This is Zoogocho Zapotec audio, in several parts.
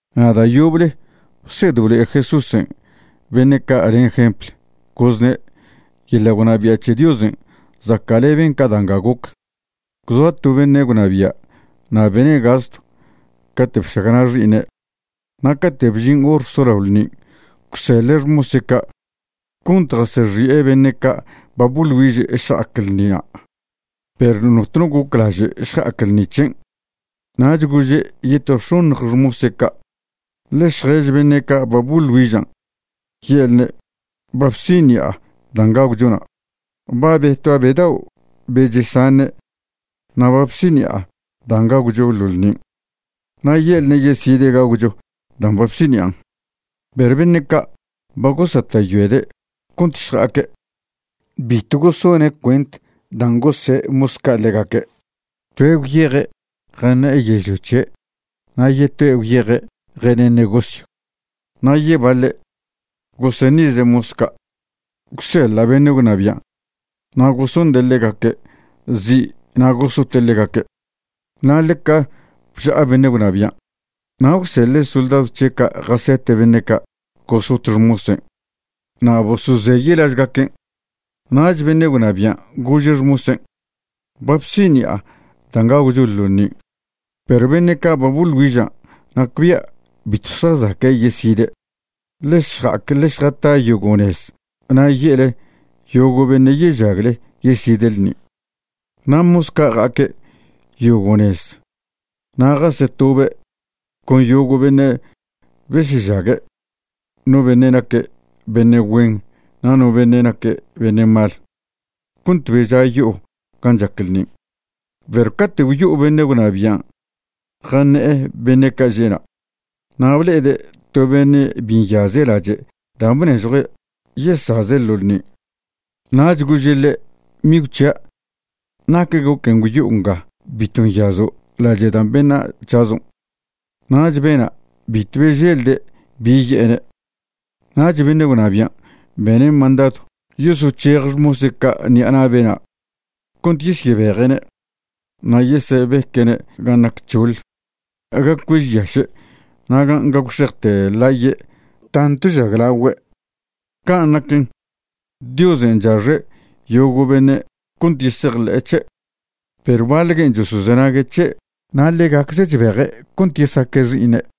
Na' da' yoble bsed blo'e Jesúsen' beṉe' ca' len jempl, gozne': ―Yeḻa' gwnabia' c̱he Diosen' zaca'leben ca da' nga goc. Gwzoa to beṉe' gwnabia' na' bene' gastw cate' bšagna' xi'iṉe'. Na' cate' bžin hor solao ḻṉin' gwseḻe' xmose' ca' cont jasexi'e beṉe' ca' ba boḻ güiže' šja'ac ḻṉina', perw notno goclaže' šja'ac ḻṉi c̱hen'. Nach gože' yeto x̱oṉj xmose' ca': “Ḻe šjež beṉe' ca' ba boḻ güižan' ye'lne' ba bsiṉi'a dan' gagwchona'. Ba betua' be dao' be chesaṉe' na' ba bsiṉi'a dan' gagwcho ḻo ḻṉin'. Na' ye'lne' yeside' gagwcho dan' ba bsiṉi'an'.” Perw beṉe' ca' ba gosata'yoede' cont šja'aque', bitw gosone' cuent dan' gose' mos ca' ḻegaque'. Toe' gwyeje' jaṉe'e yežlio c̱he', na' yetoe' gwyeje' jene' negosyw. Na' yebaḻe' goseṉize' mos ca' gwseḻa' beṉe' gwnabian' na' gosonde' ḻegaque' zi' na' gosote' ḻegaque'. Na' ḻeca bža'a beṉe' gwnabian'. Na' gwseḻe' soldadw c̱he' ca' jasete' beṉe' ca' gosot xmosen' na' bosozeye' lažgaquen'. Nach beṉe' gwnabian' gože' xmosen': “Ba bsiṉi'a dan' gagwcho ḻo ḻṉin', perw beṉe' ca' ba boḻ güiža' nacbia' bitw zjazaque' yeside'. Ḻe šja'ac ḻe šjata yogo' nez na' ye'le yogo' beṉe' yežagle yeside' ḻṉin'.” Na' mos ca' ja'aque' yogo' nez na' jasetobe' con yogo' beṉe' besežague', no beṉe' naque' beṉe' güen na' no beṉe' naque' beṉe' mal, cont beža' yo'o gan' chac ḻṉin'. ’Perw cate' gwyo'o beṉe' gwnabian' jaṉe'e beṉe' ca' že'na' na' ble'ede' to beṉe' bi nyaze' lache' da' bnežjue' yesaze' ḻo ḻṉin'. Nach gože' ḻe': “Migw c̱hia', ¿nac goquen' gwyo'o nga bitw nyazo' lache' dan' beṉa' c̱hazo'?” Nach bena' bitw beželde' bi ye'ene'. Nach beṉe' gwnabian' bene' mandadw yosoc̱hej xmose' ca' ṉi'a na' bena' cont yesyebeje'ne' na' yesebeque'ne' gan' nac c̱hoḻ, ga cuežyaše' na' gan' gagwxejte ḻaye' tantw žaglagüe'. Can' naquen, Diosen' chaxe' yogo' beṉe' cont yesejḻe'e c̱he', perw baḻ guen' chosozenague' c̱he' na' ḻegacze' chbeje' cont yesaque' xi'iṉe'.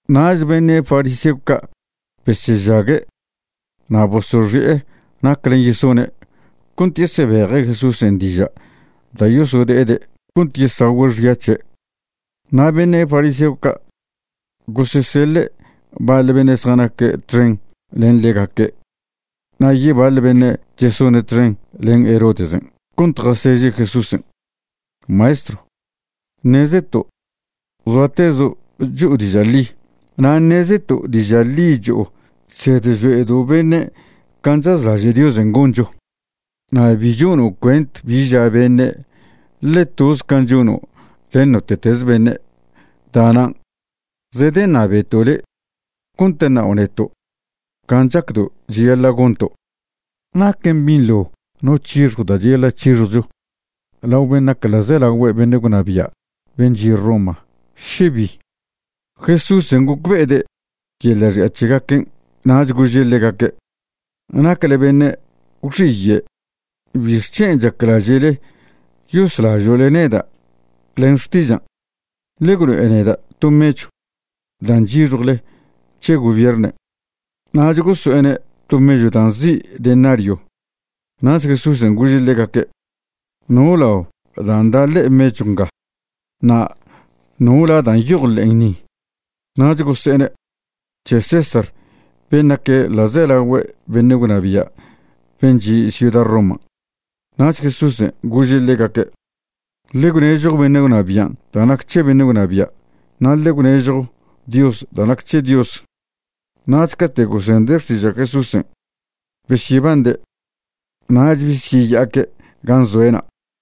Nach beṉe' fariseo ca' besežague' na' bosoxi'e naclen' yesone' cont yesebeje' Jesúsen' diža' da' yosode'ede' cont yesagüe' xya c̱he'. Na' beṉe' fariseo ca' goseseḻe' baḻ beṉe' zjanaque' txen len ḻegaque' na' yebaḻ beṉe' chesone' txen len Herodesen' cont jaseže' Jesúsen': ―Maestrw, ṉezeto' zoatezo' cho'o diža' ḻi. Na' ṉezeto' diža' ḻi cho'o chsed chlo'edo' beṉe' can' chazlaže' Diosen' goncho. Na' bi chono' cuent bi ža beṉe', ḻe toz can' chono' len note'teze beṉe'. Da'nan' zedeṉabeto' le' cont ṉao' neto' can' chacdo' cheyaḻa' gonto'. ¿Naquen binḻo no c̱hixjw da' cheyaḻa' c̱hixjwcho lao ben' nac ḻa'zelagüe beṉe' gwnabia' ben' chi' Roma, še bi? Jesúsen' gocbe'ede' yeḻa' xi'a c̱hegaquen', nach gože' ḻegaque': ―¡Nacle beṉe' gwxiye'! ¿Bixc̱hen' chaclaže'le yoslažo'le neda' len xtižan'? Ḻe gwlo'e neda' to mechw dan' chyixjwle c̱he gobiernen'. Nach goso'ene' to mechw dan' nzi' denario. Nach Jesúsen' gože' ḻegaque': ―¿No lao dan' da' ḻe'e mechw nga? na' ¿no la da' nyoj ḻe'en ni? Nach gose'ene': ―C̱he César ben' nac ḻa'zelagüe beṉe' gwnabia' ben' chi' ciuda Roman'. Nach Jesúsen' gože' ḻegaque': ―Ḻe gwnežjo beṉe' gwnabian' da' nac c̱he beṉe' gwnabia', na' ḻe gwnežjo Dios da' nac c̱he Dios. Nach cate' gosende' xtiža' Jesúsen' besyebande'. Nach besyeya'aque' gan' zoe'na'.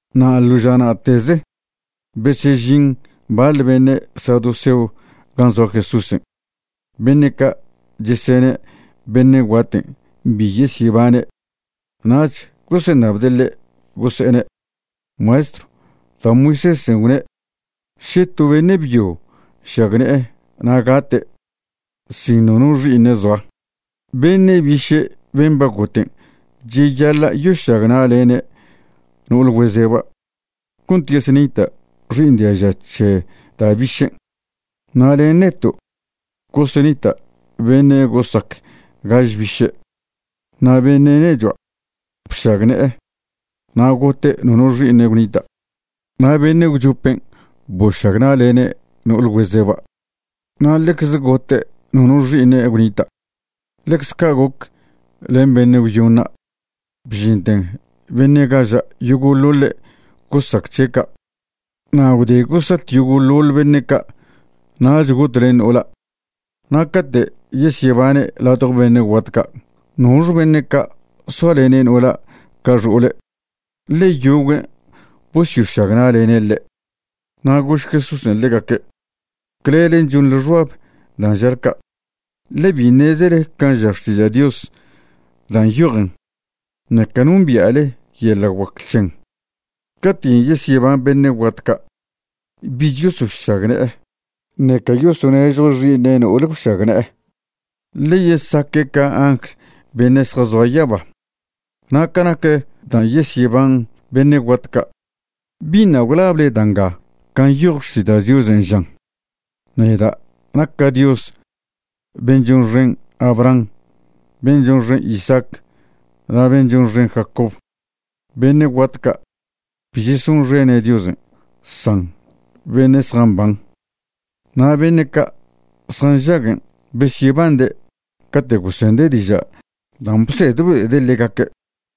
Na' ḻo ža na'teze besežin baḻ beṉe' saduceo gan' zoa Jesúsen'. Beṉe' ca' chesene' beṉe' guaten' bi yesyebane'. Nach goseṉabde' ḻe', gose'ene': ―Maestrw, da' Moisésen' gwne': “Še to beṉe' byo nšagne'e na' gate' sin nono xi'iṉe' zoa, beṉe' biše' ben' ba goten' cheyaḻa' yošagna'lene' no'ol güezeba' cont yesenita' xi'iṉ diaža c̱he da' bišen'. Na' len neto' gosenita' beṉe' gosac gaž biše'. Na' beṉe' nechua' bšagne'e, na' gote' nono xi'iṉe' gwnita'. Na' beṉe' gwchopen' bošagna'lene' no'ol güezeba'. Na' ḻecze gote' nono xi'iṉe' gwnita'. Ḻecze ca' goc len beṉe' gwyoṉa', bžinten beṉe' gaža' yogo'ḻoḻe' gosac c̱he' ca'. Na' gwde gosat yogo'ḻoḻ beṉe' ca', nach got len no'ola'. Na' cate' yesyebane' ladjo beṉe' guat ca', ¿nox beṉe' ca' soalene' no'ola' ca xo'ole'?, ḻe yoguen' bosyošagna'lene' ḻe'. Na' gož Jesúsen' ḻegaque': ―Clelen' chonḻe xbab dan' žale ca', ḻe bi ṉezele can' ža Xtiža' Dios dan' nyojen, ṉeca nombia'le yeḻa' guac c̱hen'. Caten' yesyeban beṉe' guat ca', bich yosošagne'e, ṉeca yosonežjo xi'iṉe' no'ol gwšagne'e, ḻe yesaque' ca angl beṉe' zjazoa yaba. Na' ca nac dan' yesyeban beṉe' guat ca', ¿biṉa' gwlable da' nga can' nyoj Xtiža' Diosen'? žan: “Neda' naca' Dios ben' chonxen Abraham, ben' chonxen Isaac na' ben' chonxen Jacob”. Beṉe' guat ca' bi chesonxene' Diosen', san beṉe' zjamban. Na' beṉe' ca' zjanžaguen' besyebande' cate' gosende' diža' dan' bsed blo'ede' ḻegaque'.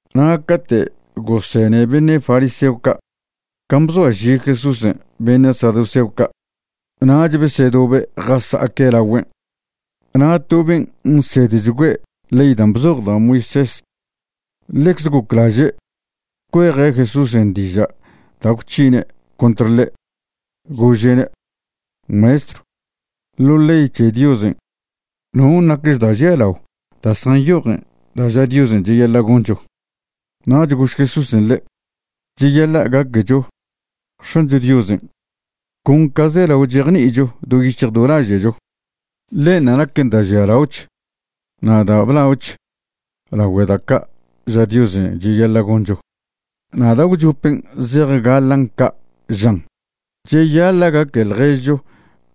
Na' cate' gosene beṉe' fariseo ca' can' bzoaži Jesúsen' beṉe' saduceo ca', nach besedobe' jasa'aque' lagüen'. Na' to ben' nsedchgüe' ley dan' bzoj da' Moisés ḻecze goclaže' cueje' Jesúsen' diža' da' gwc̱hine' contr ḻe', gože'ne': ―Maestrw, ḻo ley c̱he Diosen', ¿non' nacch da' žialao da' zjanyojen da' ža Diosen' cheyaḻa' goncho? Nach gož Jesúsen' ḻe': ―“Cheyaḻa' gaquecho X̱ancho Diosen' con ca zelao chejni'icho do yic̱hj do laže'cho.” Ḻenṉa' naquen da' žialaoch na' da' blaoch lagüe da' ca' ža Diosen' cheyaḻa' goncho. Na' da' gwchopen' zejgaḻan' ca', žan: “Cheyaḻa' gaque ḻježcho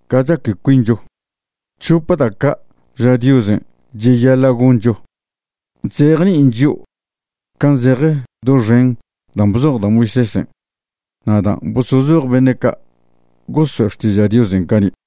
ca chaque cuincho.” C̱hope da' ca' ža Diosen' cheyaḻa' goncho chzejni'in chio' can' zeje doxen dan' bzoj da' Moisésen' na' dan' bosozoj beṉe' ca' goso'e xtiža' Diosen' cani'.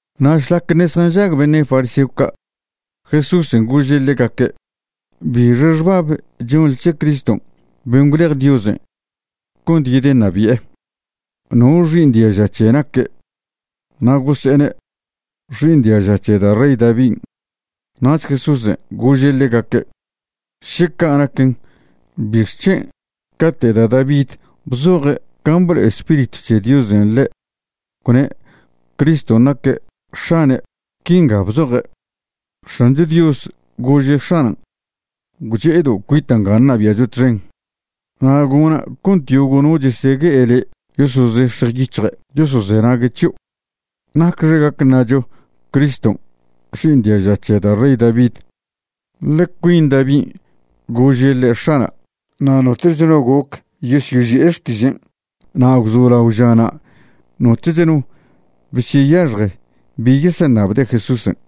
Na' šlac ṉe' zjanžag beṉe' fariseo ca', Jesúsen' gože' ḻegaque': ―¿Bixe xbab chonḻe c̱he Criston' ben' gwlej Diosen' cont yedeṉabi'e? ¿No xi'iṉ diaža c̱he naque'? Na' gose'ene': ―Xi'iṉ diaža c̱he da' rey Davin'. Nach Jesúsen' gože' ḻegaque': ―Še ca' naquen, ¿bixc̱hen' cate' da' David bzoje' can' blo'e Spiritw c̱he Diosen' ḻe', gwne' Criston' naque' X̱ane'? Quinga bzoje': X̱ancho Dios gože' X̱anan': “Gwche'edo' cuita' nga ṉabia'cho txen, na' gona' cont yogo' no chesegue'e le' yosozex̱jw yic̱hje' yosozenague' c̱hio'.” ¿Nacxe gac ṉacho Criston' xi'iṉ diaža c̱he da' rey David? ḻe cuin Davin' gože' ḻe': “X̱ana'”. Na' notoch no goc yosyoži'e xtižen'. Na' gwzolao žana' notoch no besyeyaxje bi yeseṉabde' Jesúsen'.